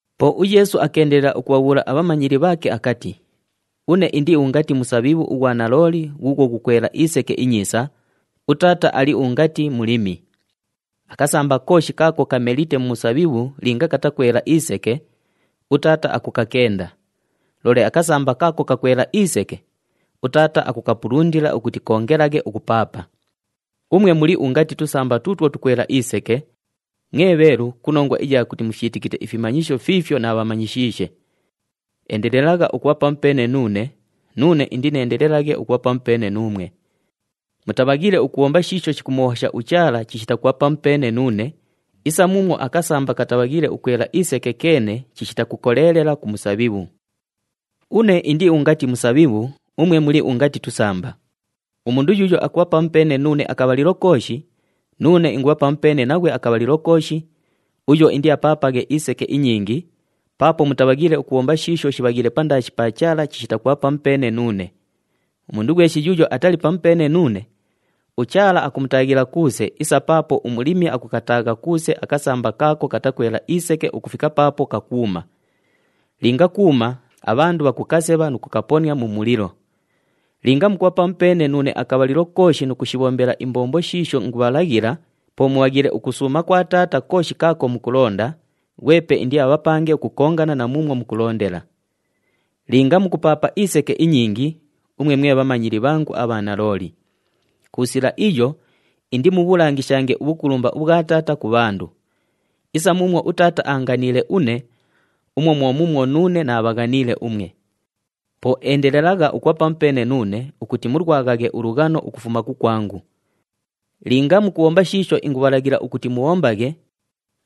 Po uYeesu akeendelela ukubhabhuula abhamanyili bhaake akati, “Une indi ungati musabhibhu ughwa nalooli ghuughwo ghukwela iseke inyiisa, uTaata ali ungati mulimi. Akasamba kooshi kaako kamelite mu musabhibhu linga katakwela iseke, uTaata akukakenda. Loole akasamba kaako kakwela iseke, uTaata akukapalundila ukuti koongelaghe ukupaapa. Umwe muli ungati tusamba tuutwo tukwela iseke, mwe bheelu ku nongwa iya kuti mufyitikite ifimanyisho fiifyo naabhamanyishiishe. Endelelagha ukubha pamupeene nuune, nuune indineendelelaghe ukubha pamupeene nuumwe. Mutabhaghiile ukubhomba shiisho shikumuhobhosha uChaala chishita kubha pamupeene nuune, isa muumwo akasamba katabhaghiile ukwela iseke keene chishita kukoleelela ku musabhibhu. “Une indi ungati musabhibhu, umwe muli ungati tusamba. Umundu yuuyo akubha pamupeene nuune akabhalilo kooshi, nuune ingubha pamupeene naghwe akabhalilo kooshi, uyo indiapaapaghe iseke inyingi, paapo mutabhaghiile ukubhomba shiisho shibhaghiile pandaashi pa Chaala chishita kubha pamupeene nuune. Umundu ghweshi yuuyo atali pamupeene nuune, uChaala akumutaaghila kuuse isa paapo umulimi akukataagha kuuse akasamba kaako katakwela iseke ukufika paapo kakwuma. Linga kuuma, abhandu bhakukasebha nu kukaponia mu mulilo. Linga mukubha pamupeene nuune akabhalilo kooshi nu kushibhombela imbombo shiisho ingubhalaghila, po mubhaghiile ukusuuma kwa Taata kooshi kaako mukulonda, ghwepe indiabhapange ukukongana na muumwo mukulondela. Linga mukupaapa iseke inyingi, umwe mwe bhamanyili bhangu abha nalooli. Ku sila iyo, indimubhulangishange ubhukulumba ubhwa Taata ku bhandu. Isa muumwo uTaata aanganiile une, umwo mwo muumwo nuune naabhaghaniile umwe. Po endelelagha ukubha pamupeene nuune ukuti mulwaghaghe ulughano ukufuma kukwangu. Linga mukubhomba shiisho ingubhalaghila ukuti mubhombaghe,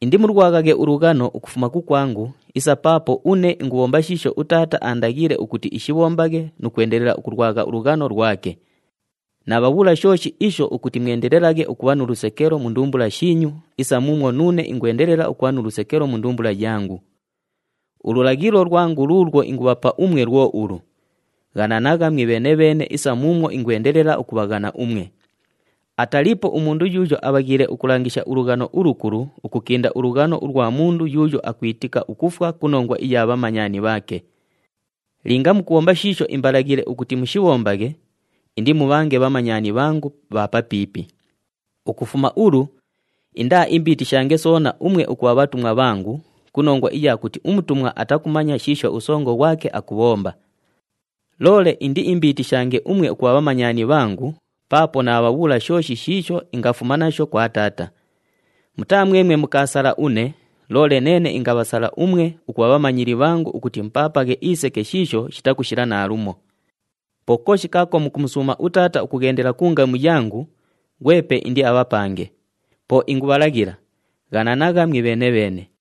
indimulwaghaghe ulughano ukufuma kukwangu isa paapo une ingubhomba shiisho uTaata aandaghiile ukuti ishibhombaghe nu kwendelela ukulwagha ulughano lwake. Naabhabhuula shooshi isho ukuti mwendelelaghe ukubha nu lusekelo mu ndumbula shiinyu isa muumwo nuune ingwendelela ukubha nu lusekelo mu ndumbula yangu. Ululaghilo lwangu luulwo ingubhapa umwe lwo ulu, ‘Ghananagha mwibheene-bheene isa muumwo ingwendelela ukubhaghana umwe.’ Ataliipo umundu yuuyo abhaghiile ukulangisha ulughano ulukulu ukukinda ulughano ulwa mundu yuuyo akwitika ukufwa ku nongwa iya bhamanyani bhaake. Linga mukubhomba shiisho imbalaghiile ukuti mushibhombaghe, indimubhange bhamanyani bhangu bha papiipi. Ukufuma ulu indaaimbiitishange soona umwe ukubha bhatumwa bhangu ku nongwa iya kuti umutumwa atakumanya shiisho usongo ghwake akubhomba. Loole indiimbiitishange umwe ukubha bhamanyani bhangu paapo naabhabhuula shooshi shiisho ingafuma nasho kwa Taata. Mutaa mwemwe mukaasala une, loole neene ingabhasala umwe ukubha bhamanyili bhangu ukuti mupaapaghe iseke shiisho shitakushila naalumo. Po kooshi kaako mukumusuuma uTaata ukughendela ku ngamu yangu, ghwepe indiabhapange. Po ingubhalaghila, ghananagha mwibheene-bheene.”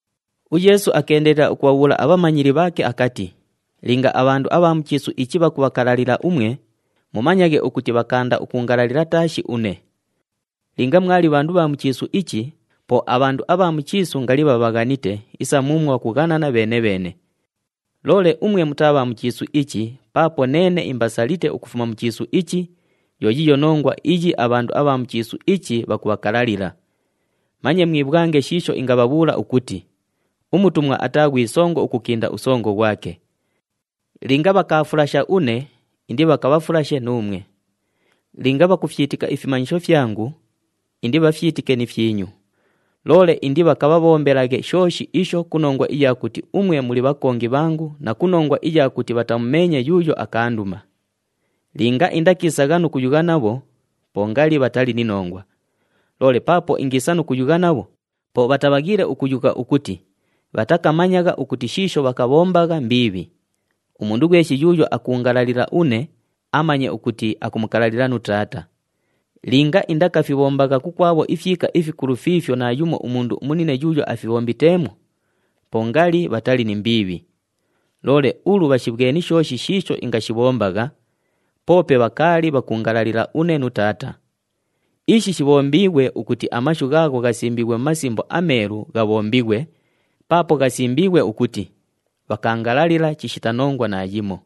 UYeesu akeendelela ukubhabhuula abhamanyili bhaake akati, “Linga abhandu abha mu chiisu ichi bhakubhakalalila umwe, mumanyaghe ukuti bhakaanda ukuungalalila taashi une. Linga mwali bhandu bha mu chiisu ichi, po abhandu abha mu chiisu ngali bhabhaghanite isa muumwo bhakughanana bheene-bheene. Loole umwe mutaa bha mu chiisu ichi paapo neene imbasalite ukufuma mu chiisu ichi, yo yiiyo nongwa iyi abhandu abha mu chiisu ichi bhakubhakalalila. Manye mwibhwange shiisho ingabhabhuula ukuti, ‘Umutumwa ataa ghwi songo ukukinda usongo ghwake.’ Linga bhakaafulasha une, indibhakabhafulashe nuumwe. Linga bhakufyitika ifimanyisho fyangu, indibhafyitike ni fyinyu. Loole indibhakabhabhombelaghe shooshi isho ku nongwa iya kuti umwe muli bhakongi bhangu na ku nongwa iya kuti bhatamumeenye yuuyo akaanduma. Linga indakiisagha nu kuyugha nabho, po ngali bhatali ni nongwa. Loole paapo ingiisa nu kuyugha nabho, po bhatabhaghiile ukuyugha ukuti bhatakamanyagha ukuti shiisho bhakabhombagha mbiibhi. Umundu ghweshi yuuyo akuungalalila une, amanye ukuti akumukalalila nu Taata. Linga indakafibhombagha kukwabho ifyika ifikulu fiifyo naayumo umundu umunine yuuyo afibhombiteemwo, po ngali bhatali ni mbiibhi. Loole ulu bhashibhweni shooshi shiisho ingashibhombagha, poope bhakaali bhakuungalalila une nu Taata. Ishi shibhombiighwe ukuti amashu ghaagho ghasimbiighwe mu Masimbo aMeelu ghabhombighwe, paapo ghasimbiighwe ukuti, ‘Bhakaangalalila chishita nongwa naayimo.’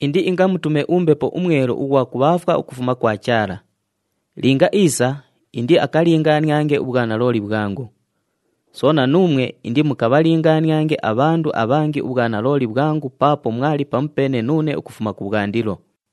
“Indiingamutume uMbepo uMwelu ughwa kubhaafwa ukufuma kwa Chaala. Linga iisa, indiakalingaaniange ubhwanalooli bhwangu. Soona, nuumwe indimukabhalingaaniange abhandu abhangi ubhwanalooli bhwangu paapo mwali pamupeene nuune ukufuma kubhwandilo.”